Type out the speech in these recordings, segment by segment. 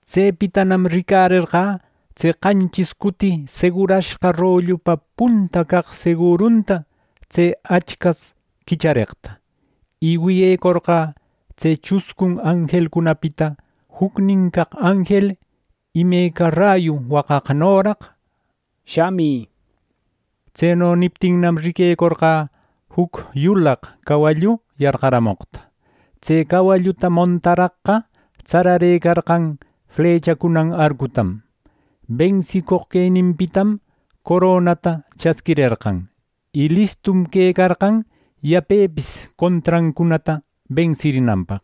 Tsepitanam ricarerqä tse qanchis cuti segurashqa rollupa punta caq segurunta tse Achcas quichareqta, y wiyecorqä tse chuscun anjelcunapita jucnin caq anjel imeca rayu waqaqnoraq “Shamï” neqta. Tseno niptinnam, riquecorqä juc yulaq cawallu yarqaramoqta. Tse cawalluta montaraqqa tsararëcarqan flechacunan arcutam. Bensicoq queninpitam coronata chasquirerqan, y listum quecarqan yapepis contrancunata bensirinanpaq.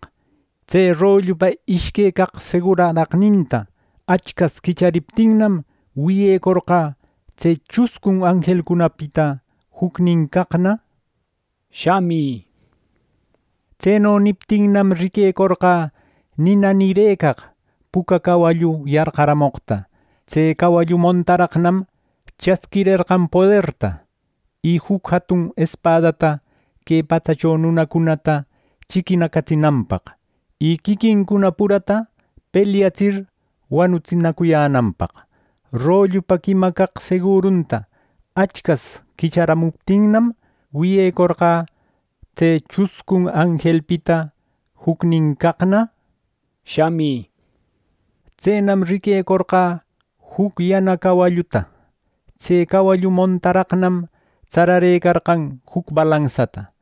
Tse rollupa ishque caq seguraraqninta Achcas quichariptinnam, wiyecorqä tse chuscun anjelcunapita jucnin caqna “Shamï” neqta. Tseno niptinnam, riquecorqä nina nirëcaq puca cawallu yarqaramoqta. Tse cawallu montaraqnam chasquirerqan poderta, y juc jatun espadata que patsacho nunacunata chiquinacatsinanpaq; y quiquincuna purata pelyatsir wanutsinacuyänanpaq. Rollupa quima caq segurunta Achcas quicharamuptinnam, wiyecorqä tse chuscun anjelpita jucnin caqna “Shamï” neqta. Tsenam riquecorqä juc yana cawalluta. Tse cawallu montaraqnam tsararëcarqan juc balansata.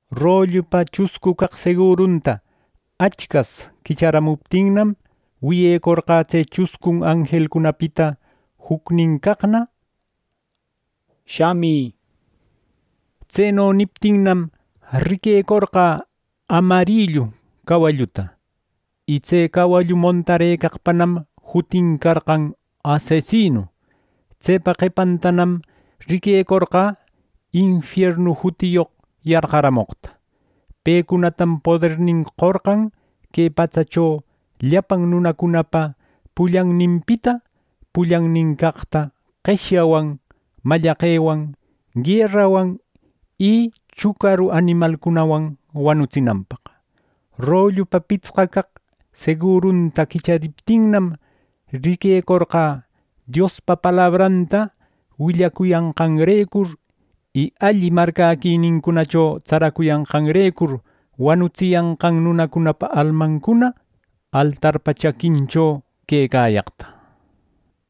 Rollupa chuscu caq segurunta Achcas quicharamuptinnam, wiyecorqä tse chuscun anjelcunapita jucnin caqna “Shamï” neqta. Tseno niptinnam, riquecorqä amarrillu cawalluta, y tse cawallu montarëcaqpanam jutin carqan “Asesinu.” Tsepa qepantanam riquecorqä “Infiernu” jutiyoq yarqaramoqta. Pecunatam podernin qorqan que patsacho llapan nunacunapa pullanninpita pullanin caqta qeshyawan, mallaqewan, guerawan, y chucaru animalcunawan wanutsinanpaq. Rollupa pitsqa caq segurunta quichariptinnam, riquecorqä Diospa palabranta willacuyanqanrecur, y alli marcäquinincunacho tsaracuyanqanrecur wanutsiyanqan nunacunapa almancuna altarpa chaquincho quecayaqta.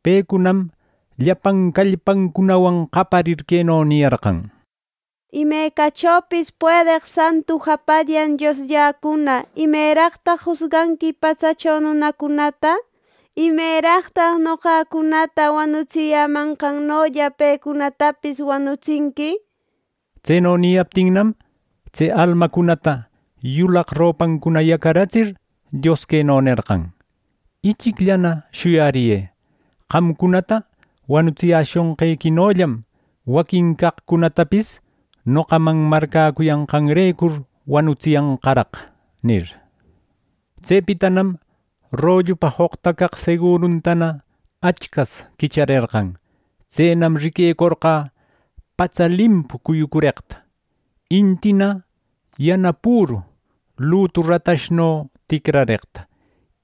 Pecunam llapan callpancunawan qaparir queno niyarqan: “Imecachopis puedeq santu japallan Dioslläcuna, ¿Imeraqtaq jusganqui patsacho nunacunata? ¿Imeraqtaq noqacunata wanutsiyämanqanolla pecunatapis wanutsinqui?” nir Tseno niyaptinnam, tse almacunata yulaq ropancuna yacaratsir Dios queno nerqan: “Ichicllana shuyariyë. Qamcunata wanutsiyäshonqequinollam, waquin caqcunatapis noqaman marcäcuyanqanrecur wanutsiyanqaraq” nir. Tsepitanam rollupa joqta caq seguruntana Achcas quicharerqan. Tsenam riquecorqä patsa limpu cuyucureqta; intina yana püru lutu ratashno ticrareqta,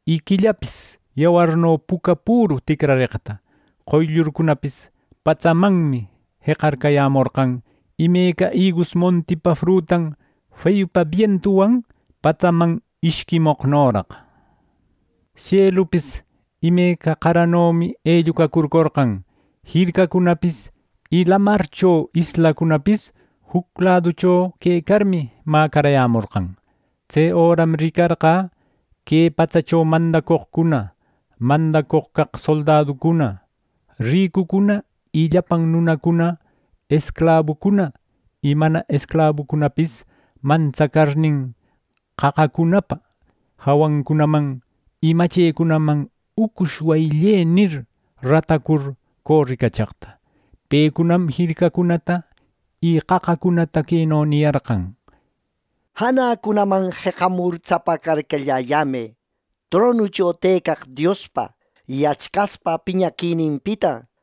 y quillapis yawarno puca püru ticrareqta. Qoyllurcunapis patsamanmi jeqayämorqan imeca igus montipa frutan feyupa bientuwan patsaman ishquimoqnoraq. Sielupis imeca qaranomi ellucacurcorqan. Jircacunapis y lamarcho islacunapis juc laducho quecarmi mäcarayämorqan. Tse öram ricarqä que patsacho mandacoqcuna, mandacoq caq soldaducuna, ricucuna y llapan nunacuna, esclabucuna y mana esclabucunapis mantsacarnin, qaqacunapa jawancunaman y machecunaman “Ucush wayille” nir, ratacur coricachaqta. Pecunam jircacunata y qaqacunata queno niyarqan: “¡Janacunaman jeqamur tsapacarcallayämë, tronucho tëcaq Diospa y Achcaspa piñaquininpita,